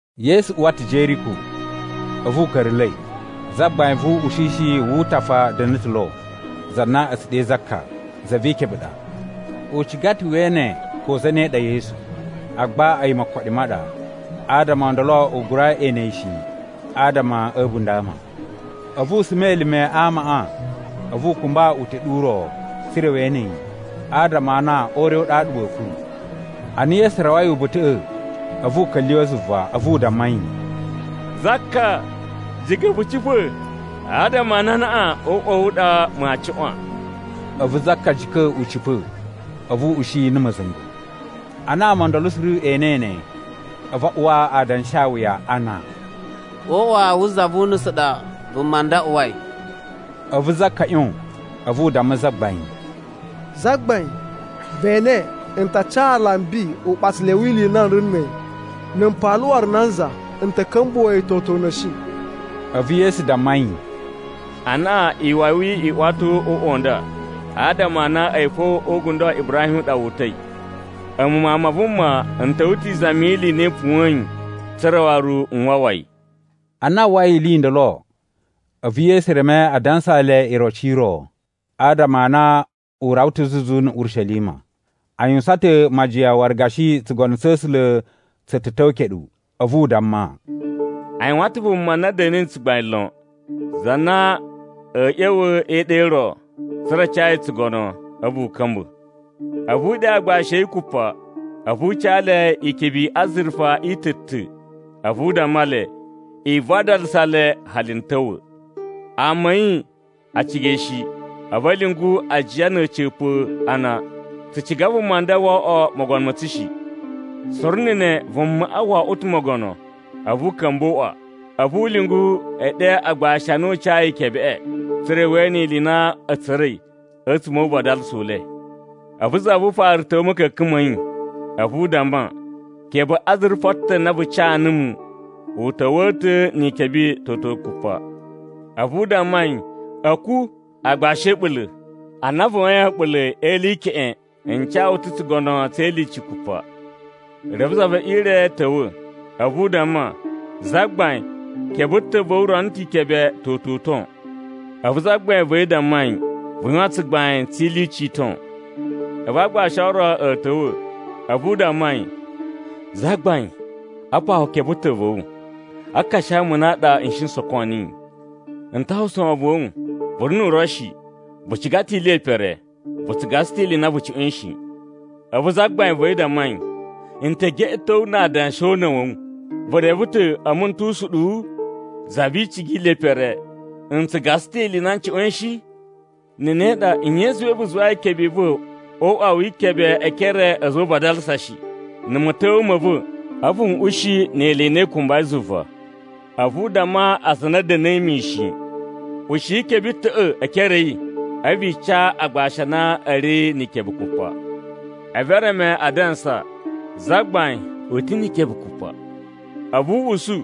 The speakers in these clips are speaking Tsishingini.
Yesu uwa ta̱ Jeriko, a̱vu u ka̱ra̱la̱i. Zagbain vu uꞌushishi wu utafa da̱na̱ ta̱ lo, za na a̱ tsu ɗe Zaka, za vi ikebe i ɗa. U ciga ta̱ we ene ko zane ɗa Yesu, agba a̱yi mokoɗi ma ɗa. Adama o ndolo u gura ene yi shi adama a̱ a̱bunda̱ a ama. A̱vu u suma elime a amaꞌa, a̱vu u kumba uteɗu u ro, tsa̱ra̱ we ene yi, adama a na o ure u ɗaɗa wa̱a̱ kuru. Ana Yesu rawai uba̱ta̱ꞌa̱, a̱vu u ka̱lyuwa̱ zuva, a̱vu u damma yi, “Zaka, jika̱ vu cipa̱, adama a na anaꞌan o uꞌwa wa̱ wu u ɗa maa cuꞌwan.” A̱vu Zaka jika̱ u cipa̱, a̱vu u ushi yi na̱ ma̱za̱nga̱. Ana ama o ndolo suru e enei ne, a̱vu a uwa adanshawuya ana, “O uꞌwa wu za vu unusu u ɗa vuma nda uwai!” A̱vu Zaka ꞌyon, a̱vu u damma Zagbain, “Zagbain, ve ene, n ta ca alambi uɓatsalai wi ili i na n ri na̱ a̱yi. Na̱ m paala waru nanza, n ta̱ ka̱mbuwa̱a̱ yi toto una̱shi.” A̱vu Yesu damma yi, “Anaꞌan iwawi i uwa ta̱ o uꞌwa u nda, adama a na a̱yi fo o ugundo wa Ibrahim u ɗa wu uta̱i. A̱mu Mawun ma Vuma n ta̱wa̱ ta̱ izami yi ili i na i puwa̱yin, tsa̱ra̱ waru n wawa yi.” Ana a uwwai ili i ndolo, a̱vu Yesu reme a dansaa le iroci i ro, adama a na u rawa ta̱ zuzu na̱ Urishelima. A yuwusan ta̱ majiyan waru gashi tsugono tsa̱ A̱sula̱ tsu ta̱ ta̱wa̱ keɗu. A̱vu u damma, “A yuwan ta̱ vuma na da̱na̱i na̱ tsugbain lon, za na a̱a̱ ꞌya̱wa̱ e iɗa i ro, tsa̱ra̱ a ca yi tsugono, a̱vu u ka̱mba̱. A̱vu u ɗe agbashi a̱ yi kupa, a̱vu u ca le ikebe i azurufa i ta̱-ta̱, a̱vu u damma le, ‘I vadalasa le hali n ta̱wa̱.’ “Ama a̱ yi a ciga yi shi, a̱vu a̱ lyungu ajiya na̱ a̱ca̱pa̱ a na, ‘Tsu ciga vuma nda wo oꞌwo mogono ma̱ tsu shi!’ “Suru na̱ ne, vumaꞌa wo oꞌwo ta̱ mogono, a̱vu u ka̱mba̱ o uꞌwa. A̱vu u lyungu e ɗe agbashi a na u cayi ikebeꞌe. Tsa̱ra̱ we ene ili i na a̱ tsura̱i a̱tsuma̱ o uvadalasa u le. “A̱vu za vu ufaru ta̱wa̱ a̱ ma̱ka̱ka̱n ma̱ yi, a̱vu u damma, ‘Kebe azurufa ta̱ na vu ca numu, u ta̱wa̱a̱ ta̱ na̱ ikebe toto kupa.’ “A̱vu u damma yi, ‘A̱ku, aagbashi a̱ a̱ɓula̱! Ana vu yuwain a̱ɓula̱ e ili i keꞌen, n ca wu ta̱ tsugono tse ilyuci kupa.’ “Reve za ve ire ta̱wa̱, a̱vu u damma, ‘Zagbain, kebe ta̱ va̱ wu rono ta̱ ikebe toto uton.’ “A̱vu zagbain va̱ yi damma yi, ‘Vu yuwan tsugbain tse ilyuci i ton.’ “A̱vu aagbashi o ro a̱ ta̱wa̱, a̱vu u damma yi, ‘Zagbain, apa wu kebe ta̱ va̱ wu! A aakashomuna a ɗa n shi n soko niyi. N ta uwwusa wovon wa̱ wu, vu ri nu uro shi, vu ciga ta̱ ili ye pere, vu tsu gasa ta̱ ili i na vu cuꞌwa̱in shi.’ “A̱vu zagbain va̱ yi damma yi, ‘N ta̱ geꞌeto wu na adanshi o una̱ wa̱ wu. Vu reve ta̱ a̱mu n tu usuɗuwu, za vi icigi yi ili ye pere, n tsu gasa ta̱ ili i na n cuꞌwa̱in shi? Na̱ ne ɗa, nye i zuwai vu zuwai ikebe i va̱ o uꞌwa wi ikebe e ekere a̱ a̱za̱ o uvadalasa shi? Na̱ ma̱ta̱wa̱a̱ ma̱ va̱, a̱vu n ushi ni ili i na i kumbai zuva.’ “A̱vu u damma aza a na a̱ da̱na̱i mishin, ‘Ushiyi kebe ta̱ꞌa̱ e ekere a̱ yi, a̱vu i ca aagbashi a na a̱ ri ni ikebe kupa.’ “A̱vu e reme a dansa, ‘Zagbain, u ta̱ ni ikebe kupa!’” “A̱vu u usu,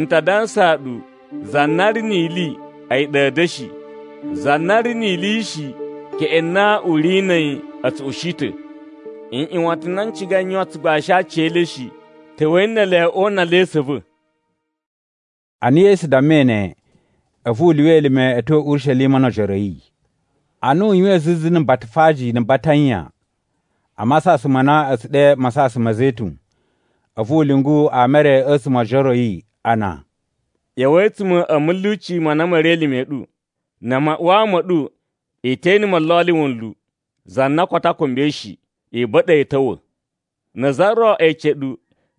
‘N ta dansaa ɗu, za na ri ni ili, a̱yi ɗa a̱ da̱shi. Za na ri ni ili shi, keꞌen na u ri na̱ a̱yi, a̱ tsu ushi ta̱. Nꞌyuwatan n na n cigai n yuwan tsugbain a aci e le shi, ta̱wa̱i ne ele o una le e esu a̱ va̱!’” Ana Yesu dammai ne, a̱vu u lyuwa elime a̱ tyo Urishelima no ojoro a̱ yi. Ana u yuwain zuzu na̱ Batafaji na̱ Batanya, a masasan ma na a̱ tsu ɗe Masasan ma̱ Zetun, a̱vu u lyungu ama e re a̱tsuma̱ o ojoro a̱ yi ana, “ꞌYa̱wa̱i a̱tsuma̱ a̱ ma̱lyuci ma na ma̱ ri elime a̱ ɗu. Na̱ maꞌuwaa ma̱ ɗu, i te ene molloli wunlu, za na koto a kumbai shi. I ba̱ɗa̱ yi a̱ ta̱wa̱. Na̱ za ro ece ɗu,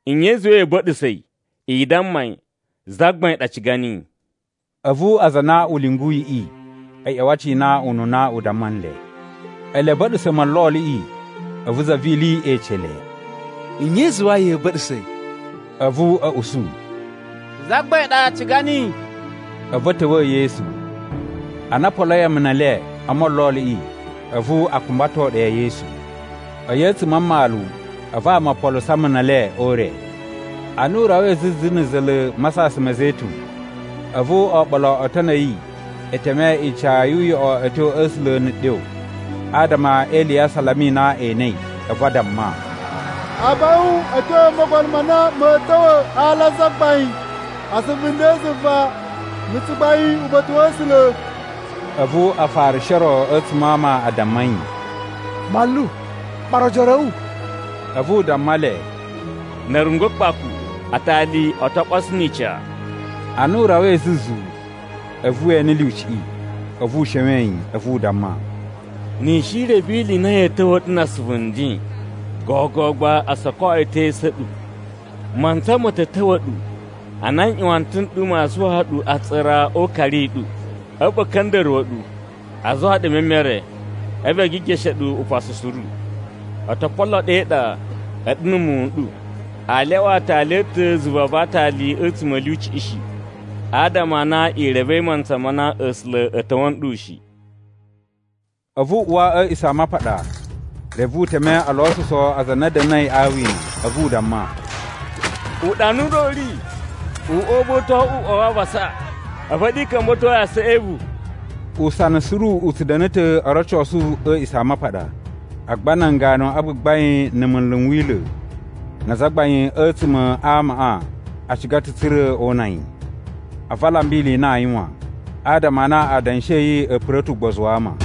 ‘Nye i zuwa ya̱a̱ ba̱ɗa̱sa̱ yi?’ I damma yi, ‘Zagbain ɗa ciga niyi.’” A̱vu aza a na u lyunguyiꞌi a̱ ꞌya̱wa̱ a cina ununa u damma nle. Ele a̱ ba̱ɗa̱sa̱ molloliꞌi, a̱vu za vi ili ece le, “Nye i zuwai ya̱a̱ ba̱ɗa̱sa̱ yi?” A̱vu a̱ usu, “Zagbain ɗa ciga niyi.” A̱vu a̱ ta̱wa̱a̱ Yesu. Ana o poloi amuna e le o molloliꞌi, a̱vu a kumbato ɗe Yesu. A̱yi a̱tsuma̱ a mmalu, a̱vu ama o poluso amuna e le o ure. Ana u rawai zuzu na̱ za̱la̱ Masasan ma̱ Zetun, a̱vu oɓolo o otoni a̱ yi e teme ica yu uyoꞌo a̱ tyo a̱ A̱sula̱ na̱ ɗyo, adama e ili ya asalama i na e enei. A̱vu a damma, “Abaꞌun a̱ tyo o Mogono ma na ma̱a̱ ta̱wa̱ a ala a Zagbain!” “Asuvu nden zuva, na̱ tsugbain uba̱ta̱ wa̱ A̱sula̱!” A̱vu Afarishi o ro a̱tsuma̱ a ama a damma yi, “Manlu, ɓara ojoro a̱ wu.” A̱vu u damma le, “Na̱ a̱ rungwa̱ kpaku, atali o to ɓoso ni ica.” Ana u rawai zuzu, a̱vu we ene lyuciꞌi, a̱vu u showen yi. A̱vu u damma, “Ni i shi i reve ili i na ya̱a̱ ta̱wa̱a̱ ɗu na asuvu nden, gogo gba o soko yi ta̱ e esu a̱ ɗu. Mantsa ma̱ ta̱ ta̱wa̱ ɗu, ana nꞌyuwatan n ɗu maa suwaa ɗu atsura o ukari u ɗu, a̱vu a̱ ka̱nda̱ruwa̱ ɗu, a zuwa ɗu e memere. A̱vu e gigeshe ɗu upasu suru. O to polo ɗu e iɗa, a̱ɗu na̱ muwun n ɗu. Aa lyawa aatali a̱ ta̱ zuva va aatali a̱tsuma̱ a̱ lyuciꞌi shi. Adama a na i revei mantsa ma na A̱sula̱ a̱ ta̱wa̱ nɗu shi.” A̱vu u uwa a̱ A̱a̱ꞌisamapaɗa, reve u teme o losuso aza a na a̱ da̱na̱i a awina. A̱vu u damma, “Uɗanu u ɗa u ri, ‘Uꞌwa u va̱ u to oꞌwo uꞌwa wa avasa.’ A̱vu a̱ɗu i ka̱mba̱to yi asaꞌa e evu.” Usana suru u tsu da̱na̱ ta̱ o rocosu a̱ A̱a̱ꞌisamapaɗa. Agba nan ganu a gbagbain na̱ munlu n Wila̱ na azagbain a̱tsuma̱ a amaꞌa a ciga ta̱ tsa̱ra̱ o una yi. A̱vu a lamba ili i na aa yuwan, adama a na adanshi a̱ yi a̱ pura̱ ta̱ ugbozu wa ama.